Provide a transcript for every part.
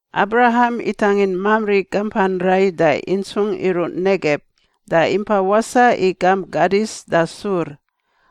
Abraham itangin Mamri gampan rai da intsungꞌ iruꞌ Negeb da impa wasaꞌ i gamp Kadis da Sur.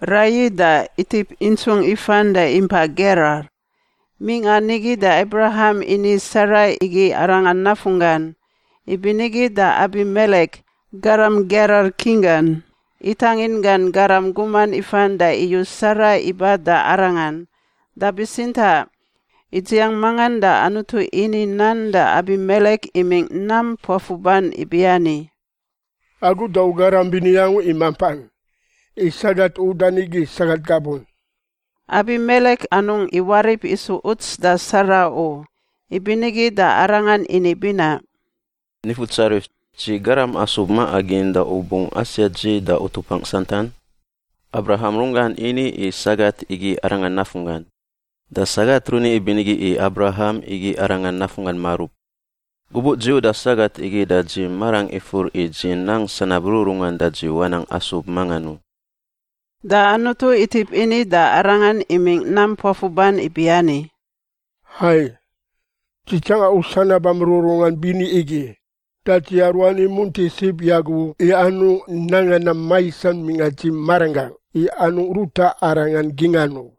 Raiyi da itip intsungꞌ ifan da impa Gerar. Mingꞌa nigi da Abraham ini Sara igi arangan nafunggan. Ibinigi da Abimelek, garam Gerar king gan, itangin gan garam guman ifan da iyu Sara iba da arangan. Da bitsintaꞌ idziang mangan da Anutu ini nan da Abimelek imingꞌ nam puafuban ibiani, “Agu da u garam bini angu i mampan, i sagat u yudan igi sagat gabun.” Abimelek anungꞌ iwarip isu uts da Sara u, ibinigi da arangan ini binaꞌ, “Nifutsarif, dzi garam asub maꞌa gin da u bungꞌ asiat dzi da utupangꞌ santan? Abraham runggan ini i sagat igi arangan nafunggan. Da sagat runi ibinigi i Abraham igi arangan nafunggan marub. Gubuꞌ dzi uda sagat igi da dzi marangꞌ ifur i dzi nang sanab rururungan da dzi wanang asub mangan u.” Da Anutu itip ini da arangan imingꞌ nam puafuban ibiani, “Hai, dzi tsanga u sanabam rururungan bini igi da dzi aruani imunti sib i agu i anungꞌ nanga nam maisan mingꞌa dzi maranggangꞌ i anungꞌ ruta arangan gingꞌan u.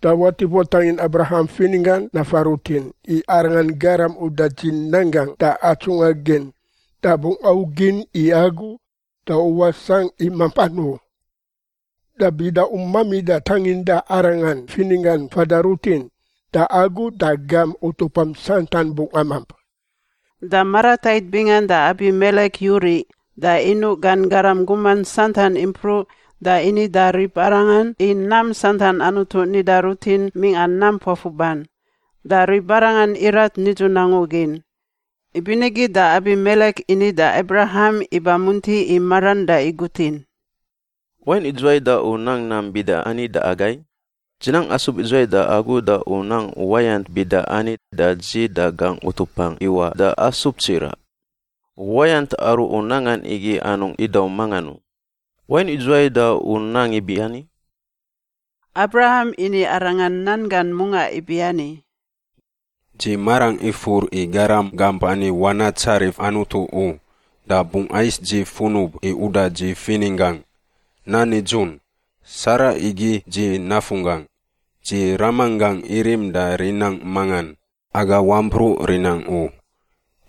Da watip watangin Abraham fininggan nafa rutin, i arangan garam uda dzi nan gangꞌ da atsungꞌa gin da bungꞌ augin i agu da u wasangꞌ i mampan u. Da bida u mamida tanginda arangan fininggan fada rutin da agu da gam utupam santan bungꞌ amamp.” Da maratait bingan da Abimelek yuriꞌ da inuꞌ gan garam guman santan impruꞌ da ini da ribarangan i nam santan Anutu nida rutin mingꞌa nam puafuban. Da ribarangan irat nidzun angu gin. Ibinigi da Abimelek ini da Abraham iba munti i maran da igutin, “Wain idzuwai da u nang nam bida ani da agai? Dzi nang asub idzuwai da agu da u nang uwayant bida ani da dzi da gangꞌ utupangꞌ iwaꞌ da asub tsiraꞌ? Uwayant aru u nangan igi anungꞌ idaum mangan u. Wain idzuwai da u nang ibiani?” Abraham ini arangan nan gan mungaꞌ ibiani, “Dzi marangꞌ ifur i garam gamp ani wanatsarif Anutu u. Da bungꞌ ais dzi funub i uda dzi fininggangꞌ. Nan nidzun, Sara igi dzi nafunggangꞌ. Dzi ramanggangꞌ irim da rinangꞌ mangan, aga wampruꞌ rinangꞌ u.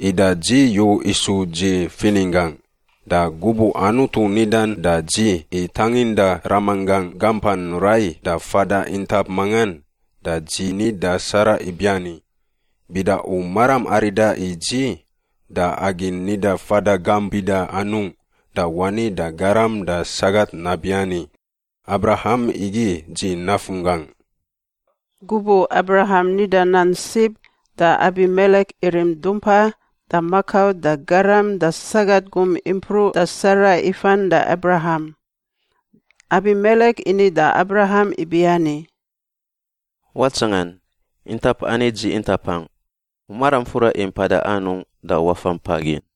Ida dzi yu isu dzi fininggangꞌ. Da gubuꞌ Anutu nidan da dzi i tanginda ramanggangꞌ gampan rai da fada intap mangan da dzi ni da Sara ibiani, ‘Bida u maram arida i dzi da agi nida fada gamp bida anungꞌ da wani da garam da sagat nabiani, “Abraham igi dzi nafunggangꞌ.”’” Gubuꞌ Abraham nida nan sib, da Abimelek irim dumpa da makau da garam da sagat gum impruꞌ da Sara ifan da Abraham. Abimelek ini da Abraham ibiani, “Watsangan. Intap ani dzi intapangꞌ. U maram fura i mpada anungꞌ da wafa mpa gin.”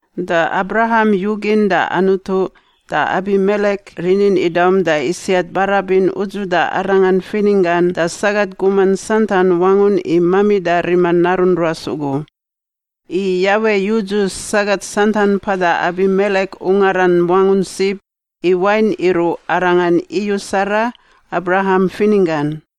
Da Abraham yugin da Anutu, da Abimelek rinin idaum da isiat barabin udzuda arangan fininggan da sagat guman santan wangun i mamida rima narun ruas ugu. I Yawe yudzu sagat santan mpada Abimelek ungaran wangun sib i wain iruꞌ, arangan iyu Sara, Abraham fininggan.